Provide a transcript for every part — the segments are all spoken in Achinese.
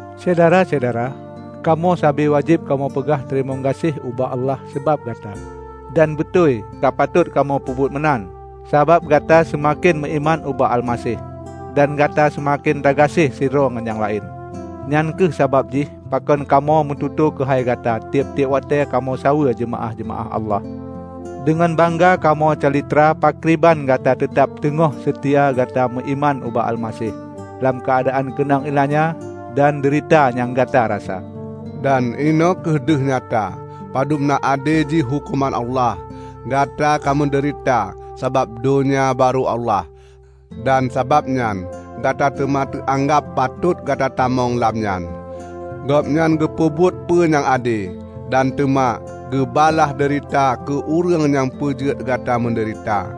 Syedara-syedara, kamoe sabe waje?b kamoe peugah teurimong gase?h ubak Allah sabab gata. Dan beuto^i kapatot kamoe peubuet meunan, sabab gata seumaken meuiman ubak Almaseh, dan gata seumaken tagase?h sidroe ngon nyang lae?n. Nyang kheueh sabab jih pakon kamoe meututoe keuhai gata tieb-tieb wate?e kamoe jak saweue jeumaa?h-jeumaa?h Allah. Deungon bangga kamoe calitra pakriban gata teutab teugoh seutia gata meuiman ubak Almaseh lam keuadaan keunong ie?lanya dan deurita nyang gata rasa. Dan inoe kheueh deuh nyata padubna ade jih huko?man Allah: Gata ka meudeurita sabab Donya Baro^ Allah, dan sabab nyan gata teuma teuanggab patot gata tamong lam nyan. Gobnyan geupeubuet peue nyang ade, dan teuma geubalaih deurita keu ureue?ng nyang peujeuet gata meudeurita.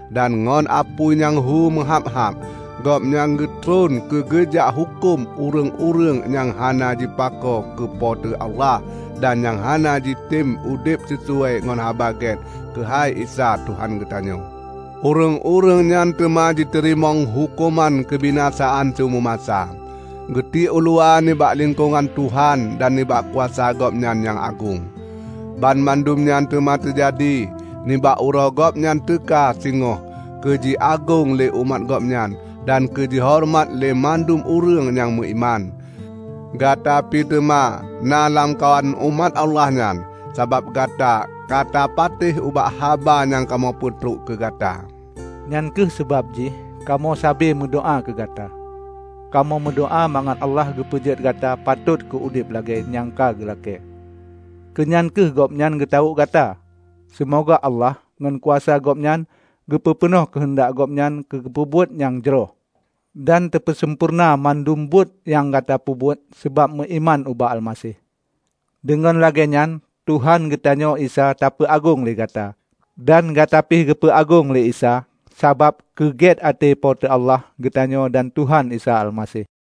dan ngon apui nyang hu meuha?b-ha?b. Gobnyan geutron keu geujak huko?m ureue?ng-ureue?ng nyang hana jipako keu Po teu Allah dan nyang hana jitem udeb sisuai ngon Haba Ge?t keuhai Isa Tuhan geutanyoe. Ureue?ng-ureue?ng nyan teuma jiteurimong huko?man keubinasaan siumu masa, geutiek uluwa nibak lingkongan Tuhan dan nibak kuasa Gobnyan nyang agong; banmandum nyan teuma teujadi nibak uroe Gobnyan teuka singoh keujiagong le? umat Gobnyan dan keu jihoreumat le? mandum ureue?ng nyang meuiman. Gata pi teuma na lamkawan umat Allah nyan, sabab gata katapate?h ubak haba nyang kamoe peutrok keugata. Nyang kheueh sabab jih kamoe sabe meudoa? keugata. Kamoe meudoa? mangat Allah geupeujeuet gata patot keu udeb lage?e nyang geulake?e; keu nyan kheueh Gobnyan geutawo?k gata. Seumoga Allah, ngon kuasa Gobnyan, teupeupeunoh keuheundak Gobnyan keu teupeubuet nyang jroh, dan teupeusampoereuna banmandum buet nyang gata peubuet sabab meuiman ubak Almaseh. Deungon lage?enyan, Tuhan geutanyoe Isa tapeuagong le? gata, dan gata pih geupeu agong le? Isa sabab keuge?t ate? Po teu Allah geutanyoe dan Tuhan Isa Almaseh.